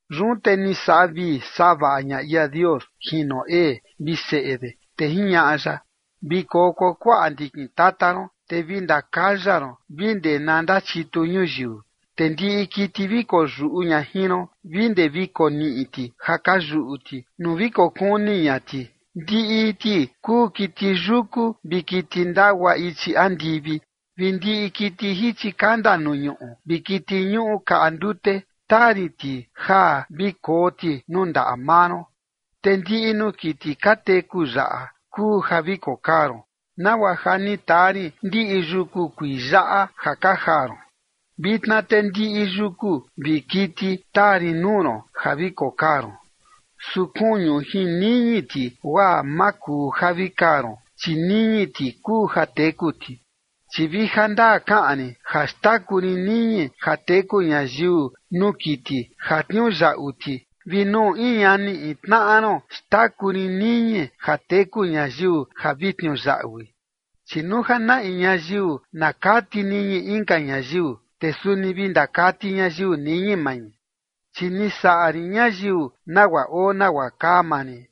Yun te ni saꞌa vii saꞌa vaꞌa ña ia Dios jin Noé vi seꞌe de, te jiñaꞌa ya: ―Vi koo kuakuaꞌa ndikin tata ron, te vi ndakaya ron vi ndee na ndachitu ñuyiu. Te ndiꞌi kiti vi koyuꞌu ña jin ron vi ndee vi koniꞌi ti ja ka yuꞌu ti nuu vi kokuni ña ti ndiꞌi ti kuu kiti yuku vi kiti ndagua ichi andivi vi ndiꞌi kiti jichi kanda nuu ñuꞌu vi kiti ñuꞌu kaꞌa ndute, taa rin ti ja vi koo ti nuu ndaꞌa maa ron. Te ndiꞌi nuu kiti ka teku yaꞌa kuu ja vi kokaa ron, nagua ja ni taa rin ndiꞌi yuku kuii yaꞌa ja ka jaa ron. Vitna te ndiꞌi yuku vi kiti taa rin nuu ron ja vi kokaa ron. Su kuñu jin niñi ti, guaa ma kuu ja vi kaa ron, chi niñi ti kuu ja teku ti. Chi vi ja ndaa kaꞌan rin ja xtaku rin niñi ja teku ñayiu nuu kiti ja tniuyaꞌu ti vi nuu in ñani in tnaꞌa ron xtaku rin niñi ja teku ñayiu ja vi tniuyaꞌui. Chi nuu ja na in ñayiu na kati niñi inka ñayiu te suni vi ndakati ñayiu niñi mai chi ni saꞌa rin ñayiu nagua oo nagua kaa maa rin.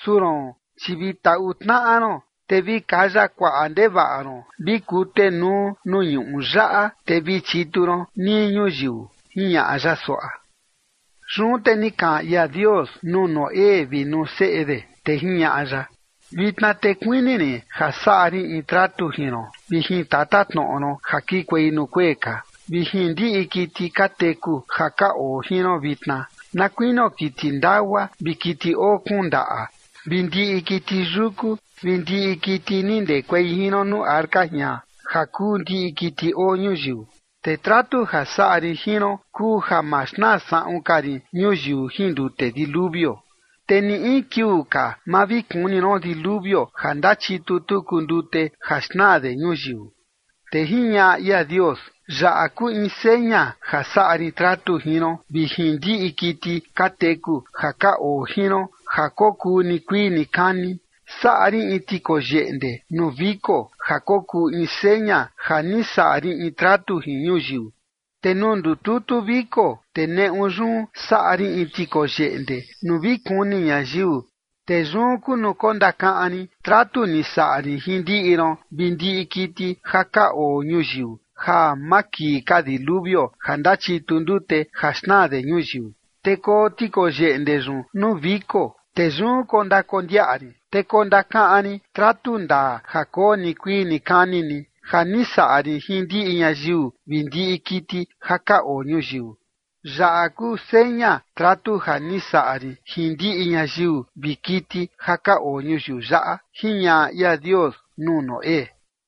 Su roon, chi vi taꞌu tnaꞌa ron te vi kaya kuaꞌa ndevaꞌa ron vi kutenuu nuu ñuꞌu yaꞌa te vi chitu ron nii ñuyiu, jiñaꞌa ya suaꞌa. Yun te ni kaꞌan ia Dios nuu Noé vi nuu seꞌe de, te jiñaꞌa ya: ―Vitna te kuini rin ja saꞌa rin in tratu jin ron vi jin tatatnoꞌo ron ja kikuei nuu kuee ka, vi jin ndiꞌi kiti ka teku ja ka oo jin ron vitna, na kuinio kiti ndagua vi kiti oo kuun ndaꞌa vi ndiꞌi kiti yuku vi ndiꞌi kiti ni ndekuei jin ron nuu arca jian ja kuu ndiꞌi kiti oo ñuyiu. Te tratu ja saꞌa rin jin ron kuu ja ma xnaa saꞌun ka rin ñuyiu jin ndute diluvio, te ni in kiuu ka ma vi kuni ron diluvio ja ndachitu tuku ndute ja xnaa de ñuyiu. Te jiñaꞌa ia Dios: ―Yaꞌa kuu in seña ja saꞌa rin tratu jin ron vi jin ndiꞌi kiti ka teku ja ka oo jin ron ja kokuu nikuii nikani. Saꞌa rin in tikoyeꞌnde nuu viko ja kokuu in seña ja ni saꞌa rin in tratu jin ñuyiu. Te nuu ndututu viko, te neꞌu yun saꞌa rin in tikoyeꞌnde nuu vi kuni ñayiu, te yun kuu nuu kondakaꞌan rin tratu ni saꞌa rin jin ndiꞌi ron vi ndiꞌi kiti ja ka oo ñuyiu ja ma kii ka diluvio ja ndachitu ndute ja xnaa de ñuyiu. Te koo tikoyeꞌnde yun nuu viko, te yun kondakondiaꞌa rin, te kondakaꞌan rin tratu ndaa ja koo nikuii nikani ni ja ni saꞌa rin jin ndiꞌi ñayiu vi ndiꞌi kiti ja ka oo ñuyiu. Yaꞌa kuu seña tratu ja ni saꞌa rin jin ndiꞌi ñayiu vi kiti ja ka oo ñuyiu yaꞌa ―jiñaꞌa ia Dios nuu Noé.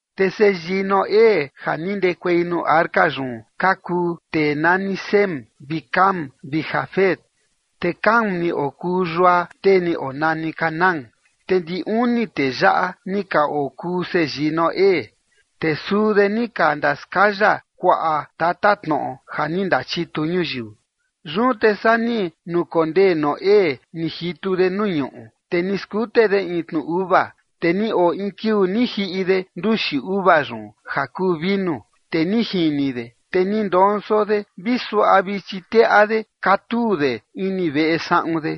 Te seyii Noé ja ni ndekuei nuu arca yun ka kuu tee nani Sem vi Cam vi Jafet. Te Cam ni okuu yua tee ni onani Canaán. Te ndi uni tee yaꞌa ni ka okuu seyii Noé, te suu de ni ka ndaskaya kuaꞌa tatatnoꞌo ja ni ndachitu ñuyiu. Yun te saa ni nukondee Noé ni jitu de nuu ñuꞌu, te ni skute de in tnu uva. Te ni oo in kiuu ni jiꞌi de nduxi uva yun ja kuu vinu. Te ni jini de, te ni ndonso de vi suaꞌa vichi teꞌa de katuu de ini veꞌe saꞌun de.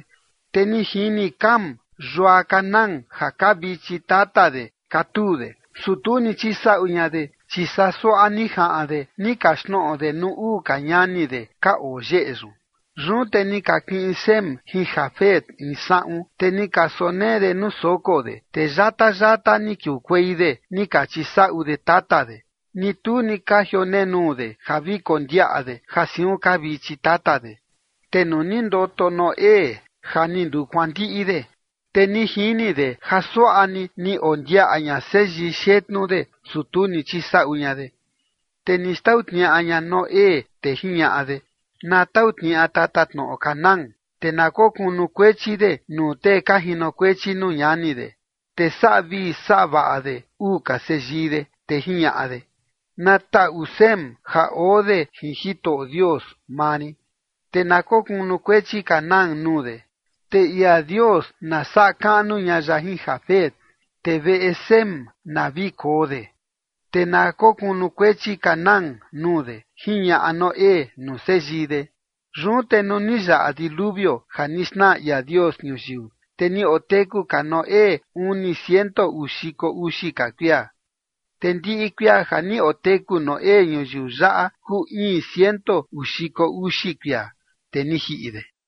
Te ni jini Cam yua Canaán ja kaa vichi tata de katuu de, su tu ni chisaꞌu ña de, chi saa suaꞌa ni jaꞌan de ni kaxtnoꞌo de nuu uu ka ñani de ka oo yeꞌe yun. Yun te ni ka kiꞌin Sem jin Jafet in saꞌun, te ni ka sonee de nuu soko de, te yata yata ni kiukuei de ni ka chisaꞌu de tata de, ni tu ni ka jionenuu de ja vi kondiaꞌa de ja siun kaa vichi tata de. Te nuu ni ndoto Noé ja ni ndukuandiꞌi de, te ni jini de ja suaꞌa ni, ni ondiaꞌa ña seyii xetnu de, su tu ni chisaꞌu ña de. Te ni xtau tniaꞌa ña Noé, te jiñaꞌa de: Na tau tniaꞌa tatatnoꞌo Canaán te na kokunukuechi de nuu tee ka jinokuechi nuu ñani de. Te saꞌa vii saꞌa vaꞌa de uu ka seyii de, te jiñaꞌa de: Na taꞌu Sem ja oo de jin Jitoꞌo Dios maa rin te na kunukuechi Canaán nuu de. Te ia Dios na saꞌa kaꞌnu ña ya jin Jafet te veꞌe Sem na vi koo de te na kokunukuechi Canaán nuu de, jiñaꞌa Noé nuu seyii de. Yun te nuu ni yaꞌa diluvio ja ni xnaa ia Dios ñuyiu, te ni oteku ka Noé uni ciento uu xiko uxi ka kuia. Te ndiꞌi kuia ja ni oteku Noé ñuyiu yaꞌa kuu iin ciento uu xiko uxi kuia, te ni jiꞌi de.